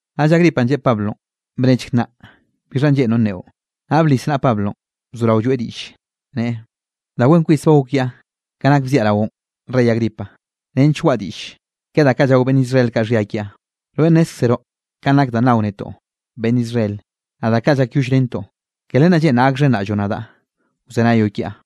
Naꞌll Agripanꞌ lleꞌe Pablonꞌ: —Bnechk nnaꞌ bixhanꞌ lleꞌnroꞌ nneꞌo. Naꞌll blis naꞌa Pablonꞌ, bzorao lloeꞌ diꞌllenꞌ, neꞌe: —Da wen kwis ba gok kiaꞌ ka nak bziaꞌ raoꞌn, rey Agripa, nench waꞌa diꞌll ke da kaꞌ llao beꞌnn Israel kaꞌ xhia kiaꞌ. Rweꞌ nnezkzroꞌ kanꞌ nak danꞌ nao netoꞌ, beꞌnn Israel, naꞌ da kaꞌ llakyollrentoꞌ. Ke len lleꞌnraꞌ gakxhenraꞌlloꞌ nadaꞌ wzenayoꞌ kiaꞌ.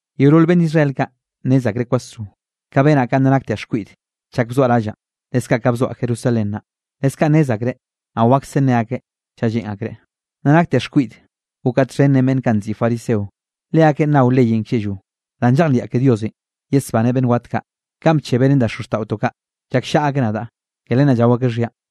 ’Yeolol beꞌnn Israel kaꞌ nnez akreꞌ kwasro, ka benaꞌ ka nna naktiaꞌ xkwiꞌde chak bzoaꞌ rallaꞌ, leskaꞌ ka bzoaꞌ Jerusalén naꞌ. Leskaꞌ nnez akreꞌ, naꞌ wakse ne akeꞌ chaꞌ lleꞌn akreꞌ, nna naktiaꞌ xkwiꞌde gokaꞌ txhen ren beꞌnn kaꞌ nziꞌi fariseo, leakeꞌn nao leyenꞌ klleꞌllo. Danꞌ llejliaꞌ ke Diosenꞌ yesbaneꞌ beꞌnn wat kaꞌ kanꞌ bchebeꞌ ren da xozxtaꞌotoꞌ kaꞌ, llakllaꞌa akeꞌ nadaꞌ, ke len naꞌ llao akeꞌ xhianꞌ.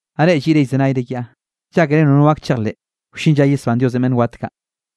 Naꞌ reꞌ lliꞌre llzenayre kiaꞌ, ¿llákere nono gak chejleꞌ wllin lla yesbán Diosenꞌ beꞌnn wat kaꞌ?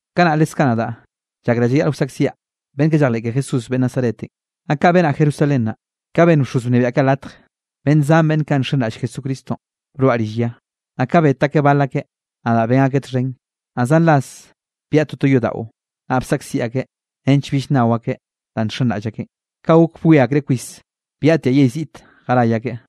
’Kanaꞌ leskaꞌ nadaꞌ llakraꞌ llayaꞌl wsaꞌkziaꞌ beꞌnn kaꞌ llejleꞌ ke Jesús beꞌnn Nazaretenꞌ. Naꞌ kaꞌ benaꞌ Jerusalén naꞌ. Ka benn bxoz wnebiaꞌ kaꞌ latj, beꞌnn zan beꞌnn kaꞌ nxenraꞌll Jesucristonꞌ broaꞌ rill ya. Naꞌ ka bet akeꞌ bal akeꞌ, nadaꞌ ben akeꞌ txhen. Naꞌ zan ras byaꞌa toto yodaꞌo, naꞌ bsaꞌkziꞌ akeꞌ nench bill nnao akeꞌ danꞌ nxenraꞌll akeꞌn. Kaꞌ gok bwie akreꞌ kwis, byaꞌtiaꞌ yell ziꞌt jaray akeꞌ.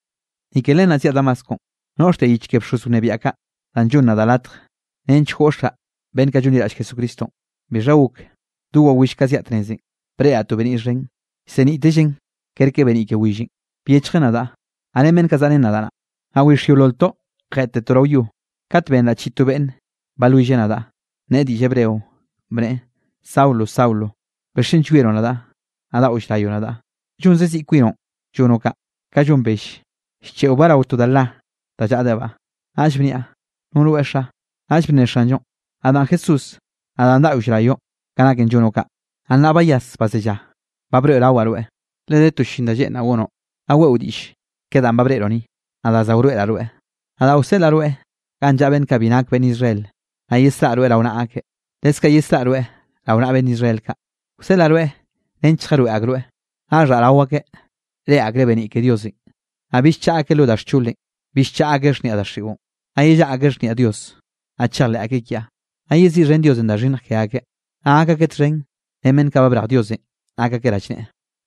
’Ni ke len zyaꞌ Damasco noꞌxtiaꞌ yich ke bxoz wnebiaꞌ kaꞌ, da llonn nadaꞌ latj nench goꞌxaꞌ beꞌnn kaꞌ llonliraꞌll Jesucristonꞌ. Bixha gok, do wawill ka zyaꞌ tnezenꞌ, breꞌraꞌ to beniꞌ xhen, llseniꞌtellen kerke beniꞌ ke willenꞌ, byechjen nadaꞌ, naꞌ ren beꞌnn kaꞌ zaꞌa ren nadaꞌ naꞌ. Naꞌ wix yeololtoꞌ jeꞌttetoꞌ rao yo, kat benraꞌ chiꞌi to beꞌnn balwilleꞌ nadaꞌ, nneꞌe diꞌll hebreo, bneꞌe: “Saulo, Saulo, ¿bixchen llwieroꞌ nadaꞌ, naꞌ daꞌo llrayoꞌ nadaꞌ? Llonze ziꞌ kwinoꞌn llonoꞌ kaꞌ, ka llon bell llcheꞌobaꞌ rao to da la, da llaꞌdebaꞌ.” Naꞌll bniaꞌ: “¿No rweꞌ, xa?” Naꞌll bnne Xanllonꞌ: “Nadaꞌn Jesús, nadaꞌn daꞌo llrayoꞌ ka naken llonoꞌ kaꞌ. Naꞌ nnaꞌ bayas bazellá, ba broeꞌrawaꞌ rweꞌ, le de to llin da lleꞌnraꞌ gonoꞌ, naꞌ weꞌo diꞌll ke danꞌ ba breꞌroꞌ ni, naꞌ da za wroeꞌraꞌ rweꞌ. Nadaꞌ wseꞌlaꞌ rweꞌ ganꞌ llaꞌa beꞌnn kaꞌ bi nak beꞌnn Israel, naꞌ yesraꞌa rweꞌ rao naꞌa akeꞌ, leskaꞌ yesraꞌa rweꞌ rao naꞌa beꞌnn Israel kaꞌ. Wseꞌlaꞌ rweꞌ nench lljaroeꞌ akroeꞌ, naꞌ xhaꞌ rao akeꞌ, reꞌe akreꞌ beniꞌ ke Diosenꞌ, naꞌ bill chaꞌa akeꞌ lo da xcholenꞌ. Bill chaꞌa akeꞌ xhniaꞌ daxiꞌon, naꞌ yellaꞌa akeꞌ xhniaꞌ Dios. Naꞌ chejleꞌ akeꞌ kiaꞌ, naꞌ yeziꞌxhen Diosenꞌ da xhinnj ke akeꞌ, naꞌ gak akeꞌ txhen ren beꞌnn kaꞌ ba brej Diosenꞌ nak akeꞌ rallneꞌe.”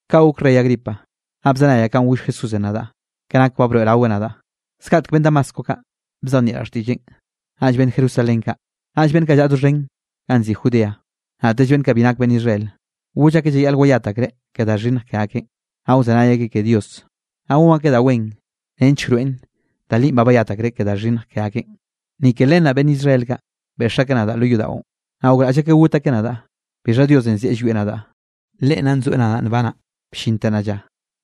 ’Kaꞌ gok rey Agripa, naꞌ bzenayaꞌ kanꞌ goll Jesúsenꞌ nadaꞌ ka nak ba broeꞌraweꞌ nadaꞌ. Zgaꞌtek beꞌnn Damasco kaꞌ, bzejnieꞌraꞌ xtiꞌlleꞌn, naꞌll beꞌnn Jerusalén kaꞌ, naꞌll beꞌnn kaꞌ llaꞌa doxhen ganꞌ nziꞌi Judea, naꞌtell beꞌnn kaꞌ bi nak beꞌnn Israel. Goll akeꞌ llayaꞌl wayat akreꞌ ke da xhinnj ke akeꞌn, naꞌ wzenay akeꞌ ke Dios, naꞌ gon akeꞌ da wen nench wroeꞌn da linꞌ ba bayat akreꞌ ke da xhinnj ke akeꞌn. Ni Ke len naꞌ beꞌnn Israel kaꞌ, beꞌx akeꞌ nadaꞌ lo yodaꞌon, naꞌ gokraꞌll akeꞌ got akeꞌ nadaꞌ. Bixha Diosenꞌ zeꞌe llwieꞌ nadaꞌ, Leꞌen nna nzoeꞌ nadaꞌ nbanaꞌ bllinte nnaꞌ lla,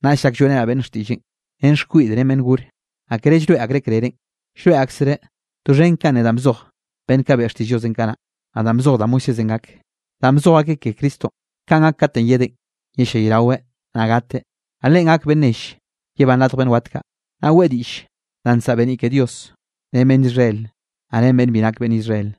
naꞌll llak lloeꞌrenaꞌ beꞌnn xtiꞌlleꞌn ren xkwiꞌd ren beꞌnn gore. Naꞌ kere llroeꞌ akreꞌ krerenꞌ, llroeꞌ aksereꞌ doxhen kanꞌ ne danꞌ bzoj beꞌnn kaꞌ beꞌe xtiꞌll Diosenꞌ kanaꞌ, naꞌ danꞌ bzoj da Moisésenꞌ gak. Danꞌ bzoj akeꞌ ke Cristonꞌ kanꞌ gak katenꞌ yedeꞌn, yellayraweꞌ, naꞌ gateꞌ, naꞌ Leꞌen gakeꞌ beꞌnn nell yebán radj beꞌnn wat kaꞌ. Naꞌ weꞌe diꞌll danꞌ nsaꞌa beniꞌ ke Diosenꞌ, ren beꞌnn Israel, naꞌ ren beꞌnn bi nak beꞌnn Israel.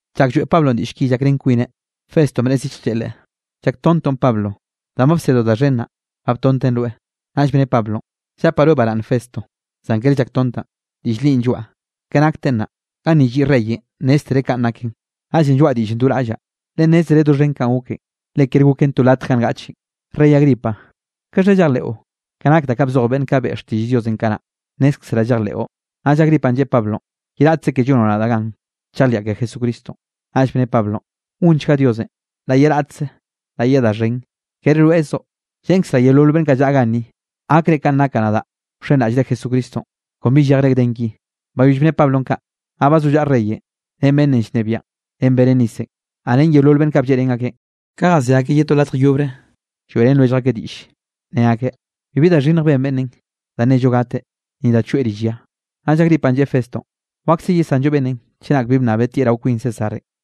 Chak lloeꞌ Pablonꞌ diꞌll ki llakrén kwineꞌ, Festonꞌ bnneꞌe zillj, lleꞌe leꞌe: —Llaktontoꞌn, Pablo, danꞌ ba bsedoꞌ da xhen naꞌ, ba btonten rweꞌ. Naꞌll bne Pablonꞌ: —Llapaꞌ rweꞌ baraꞌnne, Festo, zan kere llaktontaꞌn, diꞌll linꞌ lloaꞌ, ke nakten naꞌ. Ganni lliꞌ reyenꞌ nnéztereꞌ kanꞌ naken, naꞌllenꞌ lloaꞌ diꞌllenꞌ do raꞌllaꞌ, leꞌe nnezreꞌ doxhen kanꞌ goken, le kere goken to latj ga ngaꞌchen. Rey Agripa, ¿kaxha llejleꞌo ka nak da kaꞌ bzoj beꞌnn kaꞌ beꞌe xtiꞌll Diosenꞌ kanaꞌ? Nnézkzeraꞌ llejleꞌo. Naꞌll Agripanꞌ lleꞌe Pablonꞌ: —Ye raꞌtze ke llonoꞌ nadaꞌ gan, chejliaꞌ ke Jesucristonꞌ. Naꞌll bne Pablonꞌ: —Gonchga Diosenꞌ, la ye raꞌtze, la ye da xhen, kere rweꞌzoꞌ, lleꞌnkazraꞌ yeolol beꞌnn kaꞌ llaꞌa ganni, gakre kanꞌ nakaꞌ nadaꞌ wxenraꞌllre Jesucristonꞌ, kon bi llejre gden ki. Bayoll bne Pablonꞌ kaꞌ, naꞌ bazollaꞌa reyenꞌ ren beꞌnnenꞌ llnebiaꞌn ren Berenicenꞌ, naꞌ ren yeolol beꞌnn kaꞌ blleꞌrén akeꞌn. Ka jasé akeꞌ ye to latj yobre, lloeꞌrén lwellj akeꞌ diꞌlle, ne akeꞌ: —Bibi da xhinnj ben beꞌnnenꞌ da nello gateꞌ, ni da choeꞌ rill ya. Naꞌll Agripanꞌ lleꞌe Festonꞌ: —Wakse yesanllo beꞌnnenꞌ chenak bi bnnabeꞌ tieꞌ rao kwin Césarenꞌ.